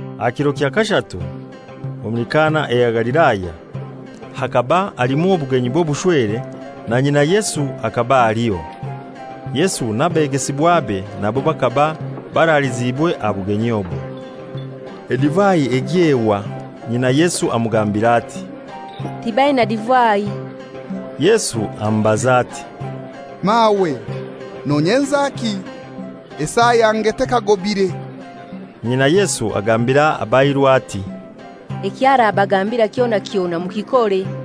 Aha kiro kya kashatu, omuli Kana eya Galilaya, bhakaba halimu obugenyi bw'obushwere; na nyina Yesu hakaba aliho. Yesu n'abegesibwabe nabo bakaba baraliziibwe aha bugenyi obwo. Edivai egya ehwa, nyina Yesu amugambira ati, «Tibaina divai.» Yesu amubaza ati, «Mawe, nonyenzaki? Esaa yange tekagobire.» Nyinai Yesu agambira abairu ati, «Eky'arabagambira kyona kyona mukikore.»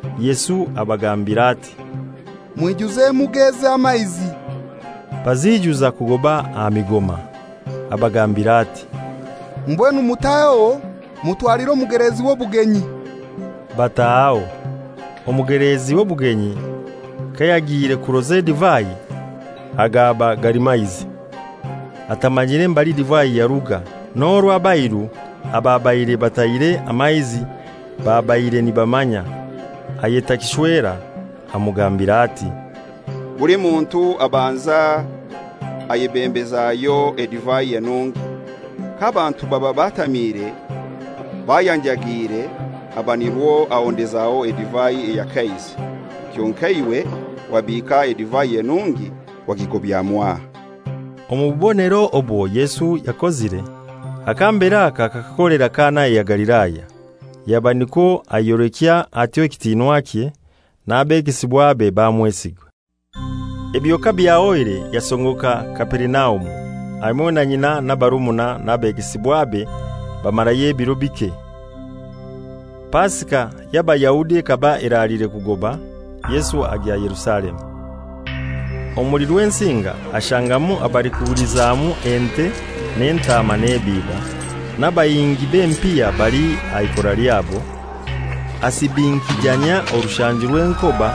Yesu abagambira ati, «Mwijuze emuga ezi amaizi.» Baziijuza kugoba aha migoma. Abagambira ati, «Mbwenu mutaheho mutwalire omugelezi w'obugenyi.» Batahaho. Omugeleezi w'obugenyi kayagiire kuroza edivai, agaba gali maizi, atamanyire mbali divai yaruga (n'orwo abairu ababaire batahire amaizi babaire nibamanya), ayeta kishwera amugambira ati, «Buli muntu abanza ayebembezayo edivai enungi. K'abantu baba batamiire bayanjagiire, aba nirwo ahondezaho edivai eya kaizi. Kyonkai iwe wabiika edivai enungi wagigobya mwaha!» Omu bubonero obwo Yesu yakozire, aka mbere aka akakakolera Kana eya Galilaya, yaba nikwo ayolekya atyo ekitinwakye; n'abegesibwabe bamwesiga. Ebyo kabyahoire yasongoka Kaperinaumu, hamoi na nyina n'abarumuna n'abegesibwabe, bamarayo ebiro bike. Pasika y'Abayahudi ekaba eraliire kugoba, Yesu agya Yerusalemu. Omuli Rwensinga ashangamu abalikugulizamu ente n'entaama n'ebiiba, n'abahingi b'empiha bali aha ikora lyabo. Asibinkijanyia orushanju rw'enkoba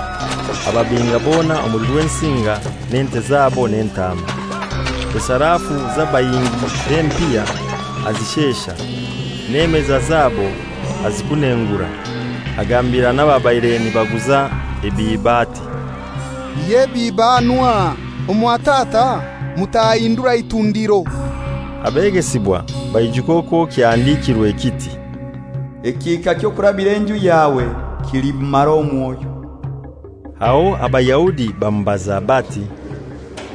ababinga bona omuli Rwensinga n'ente zabo n'entaama. Esarafu z'abahingi b'empiha azishesha, n'emeza zabo azikunengura. Agambira n'ababaire nibaguza ebiiba ati, «Ihya ebiiba hanu aha; omwa Tata mutahahindura itundiro.» Abegesibwa baijuka okwo kyahandikirwe kiti, «Ekihika ky'okurabira enju yawe kilimmara omwoyo.» Aho Abayahudi bamubaza bati,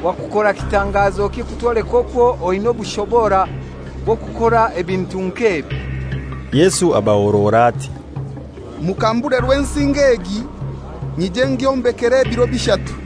«Wakukora kitangazoki kutwoleka okwo oinai obushobora bw'okukora ebintu nk'ebi?» Yesu abahorora ati, «Mukambure Rwensinga egi, nyije ngyombekere ebiro bishatu.»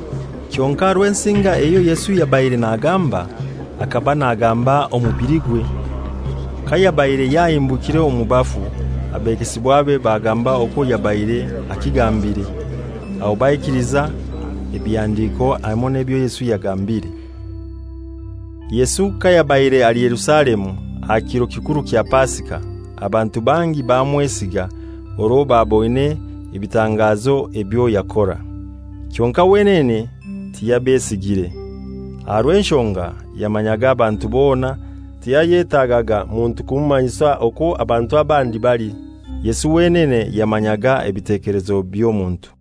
Kyonkai Rwensinga eyo Yesu yabaire nagamba, hakaba nagamba omubiligwe. Kayabaire yahimbukire omu bafu, abegesibwabe bagamba okwo yabaire akigambire; aho baikiliza ebihandiko hamoi n'ebyo Yesu yagambire. Yesu kayabaire ali Yerusalemu aha kiro kikuru kya Pasika, abantu bangi bamwesiga orwo baboine ebitangazo ebyo yakora. Kyonkai wenene tiyabesigire, aha rw'enshonga yamanyaga abantu bona, tiyayetagaga muntu kumumanyisa okwo abantu abandi bali. Yesu wenene yamanyaga ebitekelezo by'omuntu.